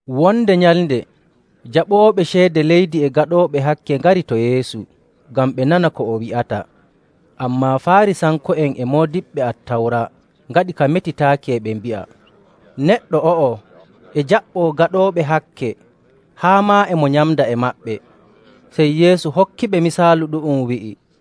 Wonde nyalnde jaɓooɓe ceede leydi e gaɗooɓe hakke ngari to Yeesu ngam ɓe nana ko o wi'ata. Ammaa Faarisanko'en e moodiɓɓe Attawra ngaɗi ka metitaaki e ɓe mbi'a, “Neɗɗo o'o e jaɓɓoo gaɗooɓe hakke haa maa e mo nyamda e maɓɓe.”. Sey Yeesu hokkiɓe misaalu ɗu'um, wi'i,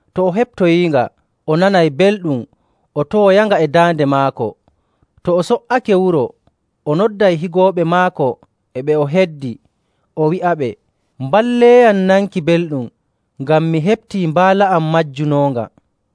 To o heɓtoyiinga, o nanay belɗum o towoyanga e daande maako. To o so''ake wuro, o nodday higooɓe maako e ɓe o heddi, o wi'aɓe, ‘Mballeeyam nanki belɗum ngam mi heɓtii mbaala am majjunoonga.’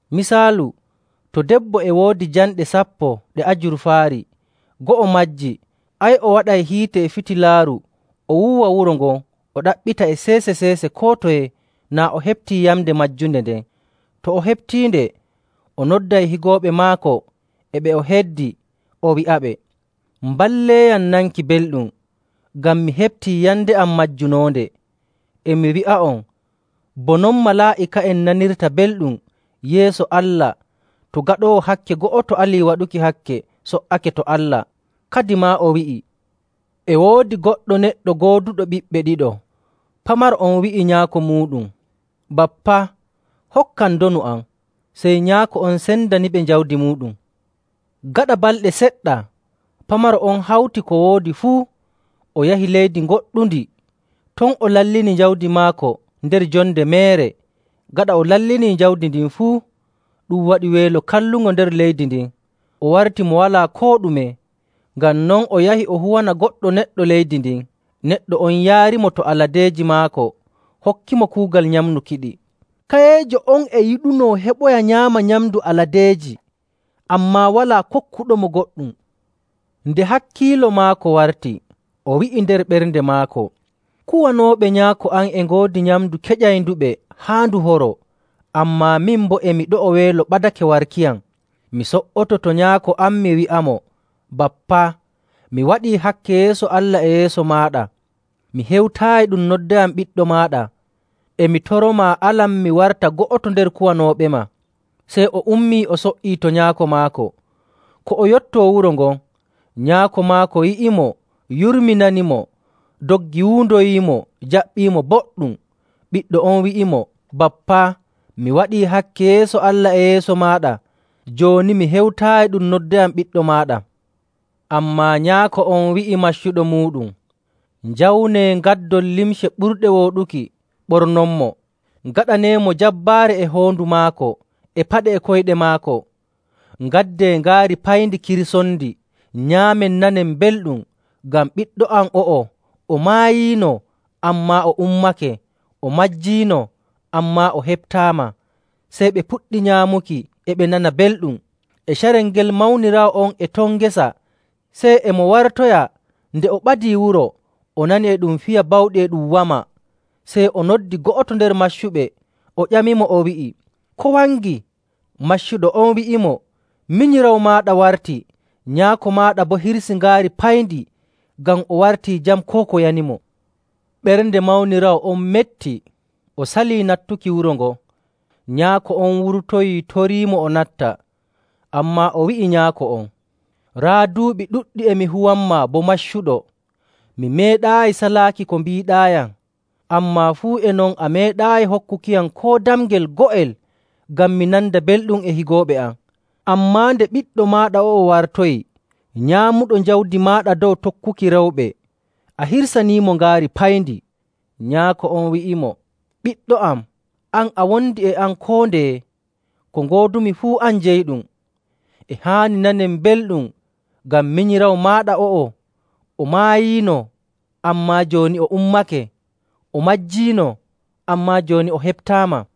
“Misaalu, to debbo e woodi jamɗe: Yamnde go'o e fottidi e ceede kuugal nyalnde go'o. sappo ɗe ajurfaari, go'o majjii, ay o waɗay hiite e fitilaaru, o wuuwa wuro ngon, o ɗaɓɓita e seese‑seese koo toye naa o heɓtii yamnde majjunde nden. To o heɓtiinde, o nodday higooɓe maako e ɓe o heddi, o wi'aɓe, ‘Mballeeyam nanki belɗum, ngam mi heɓtii yamnde am majjunoonde.’ E mi wi'a'on, bo non malaa'ika'en nanirta belɗum yeeso Allah to gaɗoowo hakke go'oto alii waɗuki hakke so''ake to Allah.” Kadimaa o wi'i, “E woodi goɗɗo neɗɗo gooduɗo ɓiɓɓe ɗiɗo. Pamaro on wi'i nyaako muuɗum, ‘Bappa, hokkam ndonu am.’ Sey nyaako on sendaniɓe jawdi muuɗum. Gaɗa balɗe seɗɗa, pamaro on hawti ko woodi fuu, o yahi leydi ngoɗɗundi, ton o lallini jawdi maako nder jonde meere. Gaɗa o lallinii jawdi ndin fuu, ɗum waɗi weelo kallungo nder leydi ndin, o warti mo walaa koo ɗume. Ngam non o yahi o huwana goɗɗo neɗɗo leydi ndin, neɗɗo on yaarimo to aladeeji maako hokkimo kuugal nyamnukiɗi. Kayeejo on e yiɗunoo to o heɓayno o nyaama nyamndu aladeeji, ammaa walaa kokkuɗomo goɗɗum. Nde hakkiilo maako warti, o wi'i nder ɓernde maako, ‘Kuwanooɓe nyaako am e ngoodi nyamndu keƴaynduɓe haa ndu horoo, ammaa min boo e mi ɗo'o weelo ɓadake warkiyam. Mi so''oto to nyaako am, mi wi'amo, “Bappa, mi waɗii hakke yeeso Allah e yeeso maaɗa. Mi hewtaayi ɗum noddayam ɓiɗɗo maaɗa, e mi toromaa alam mi warta go'oto nder kuwanooɓema.” ’ Sey o ummii o so''ii to nyaako maako. “Ko o yottoo wuro ngon, nyaako maako yi'imo yurminanimo, doggi wuundoyiimo jaɓɓiimo boɗɗum. Ɓiɗɗo on wi'imo, ‘Bappa, mi waɗii hakke yeeso Allah e yeeso maaɗa, jooni mi hewtaayi ɗum noddayam ɓiɗɗo maaɗa.’ Ammaa nyaako on wi'i maccuɓe muuɗum, ‘Njawnee ngaddon limce ɓurɗe wooɗuki, ɓornonmo. Ngaɗaneemo jabbaare e hoondu maako e paɗe e koyɗe maako. Ngaddee ngaari payndi, kirsonndi, nyaamen nanen belɗum, ngam ɓiɗɗo am o'o, o maayiino, ammaa o ummake, o majjiino, ammaa o heɓtaama!’ Sey ɓe puɗɗi nyaamuki, e ɓe nana belɗum. “E carel ngel mawniraawo on e ton ngesa. Sey e mo wartoya, nde o ɓadii wuro, o nani e ɗum fiya bawɗi e ɗum wama. Sey o noddi go'oto nder maccuɓe o ƴamimo, o wi'i, ‘Ko wangi?’ Maccuɗo on wi'imo, ‘Minyiraawo maaɗa warti, nyaako maaɗa boo hirsii ngaari payndi ngam o wartii jam koo ko yanimo.’ Ɓernde mawniraawo on metti o salii nattuki wuro ngon. Nyaako on wurtoyii toriimo o natta. Ammaa o wi'i nyaako on, ‘Raa, duuɓi ɗuɗɗi e mi huwanmaa bo maccuɗo, mi meeɗaayi salaaki ko mbiiɗaayam, ammaa fuu e non a meeɗaayi hokkukiyam koo damngel go'el ngam mi nanda belɗum e higooɓe am. Ammaa nde ɓiɗɗo maaɗa o'o wartoyi, nyaamuɗo jawdi maaɗa dow tokkuki rewɓe, a hirsaniimo ngaari payndi.’ “Nyaako on wi'imo, ‘Ɓiɗɗo am, an a wondi e am koo ndeye, ko ngoodumi fuu an jeyiɗum. E haani nanen belɗum, ngam minyiraawo maaɗa o'o o maayiino, ammaa jooni o ummake, o majjiino, ammaa jooni o heɓtaama.’”